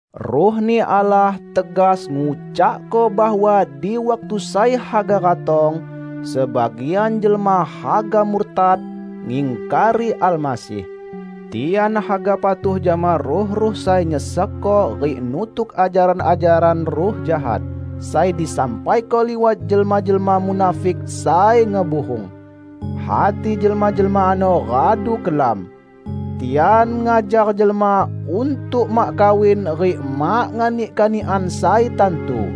Ruh-Ni Allah tegas ngucakko bahwa di waktu sai haga ratong, sebagian jelma haga murtad, ngingkari Almasih. Tian haga patuh jama ruh-ruh sai nyesekko rik nutuk ajaran-ajaran ruh jahat, sai disampaiko liwat jelma-jelma munafik sai ngebuhung. Hati jelma-jelma ano radu kelam. Tian ngajar jelma untuk mak kawin rik mak nganik kanikan sai tantu.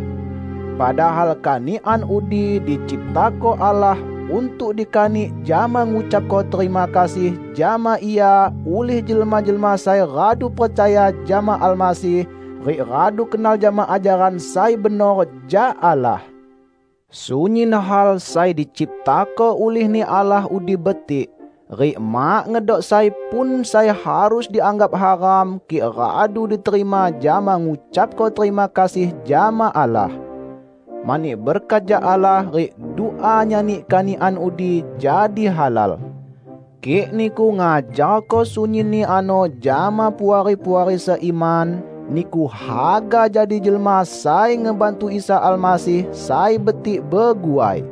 Padahal kanikan udi diciptako Allah untuk dikanik jama ngucapko terima kasih jama Ia ulih jelma-jelma sai radu percaya jama Almasih rik radu kenal jama ajaran sai benor jak Allah. Sunyin hal sai diciptako ulih-Ni Allah udi betik, rik mak ngedok sai pun sai harus dianggap haram kik radu diterima jama ngucapko terima kasih jama Allah. Mani berkat jak Allah rik dua nyani kanikan udi jadi halal. Kik niku ngajarko sunyinni ano jama puari-puari seiman niku haga jadi jelma sai ngebantu Isa Almasih sai betik beguai.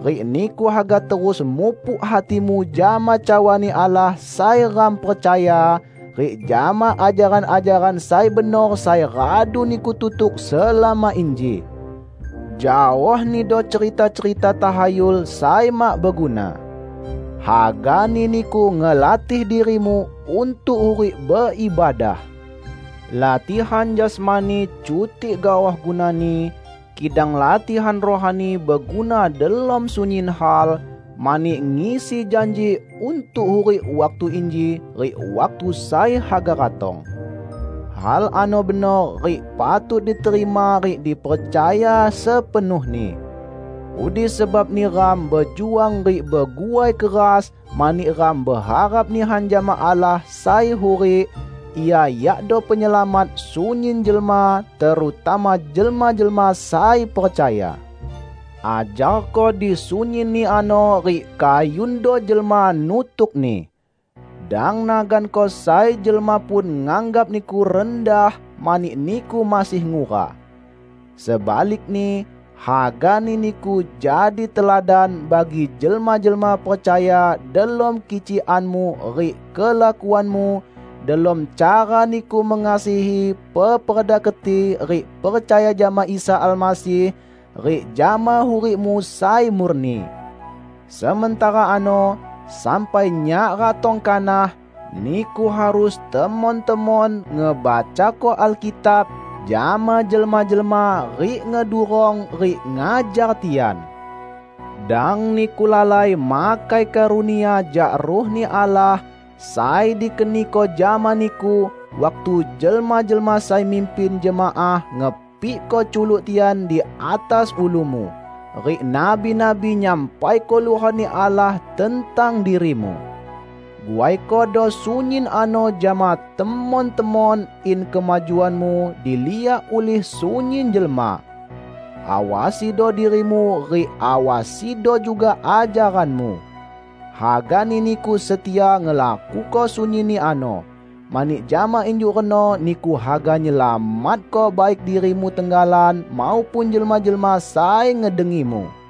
Rik niku haga terus mupuk hatimu jama cawa-Ni Allah sai ram percaya, rik jama ajaran-ajaran sai benor sai radu niku tutuk selama inji. Jaohnido cerita-cerita tahayul sai mak beguna. Hagani niku ngelatih dirimu untuk hurik beibadah. Latihan jasmani cutik gaoh gunani, kidang latihan rohani beguna delom sunyin hal, mani ngisi janji untuk hurik waktu inji rik waktu sai haga ratong. Hal ano benor rik patut diterima rik dipercaya sepenuhni. Udi sebabni ram bejuang rik beguai keras mani ram beharap nihan jama Allah sai hurik; Ia yakdo Penyelamat sunyin jelma, terutama jelma-jelma sai percaya. Ajarko di sunyinni ano rik kayundo jelma nutukni. Dang naganko sai jelma pun nganggap niku rendah mani niku masih ngura. Sebalikni, hagani niku jadi teladan bagi jelma-jelma percaya delom kicikanmu rik kelakuanmu, delom cara niku mengasihi peperda keti rik percaya jama Isa Almasih, rik jama hurikmu sai murni. Sementara ano, sampai nyak ratong kanah, niku harus temon-temon ngebacako Alkitab jama jelma-jelma rik ngedurong rik ngajar tian. Dang niku lalai makai karunia jak Ruh-Ni Allah sai dikeniko jama niku waktu jelma-jelma sai mimpin jemaah ngepikko culuk tian di atas ulumu, rik nabi-nabi nyampaiko luhot-Ni Allah tentang dirimu. Guaikodo sunyin ano jama temon-temon in kemajuanmu diliak ulih sunyin jelma. Awasido dirimu rik awasido juga ajaranmu. Hagani niku setia ngelakuko sunyinni ano, mani jama injuk reno niku haga nyelamatko baik dirimu tenggalan maupun jelma-jelma sai ngedengimu.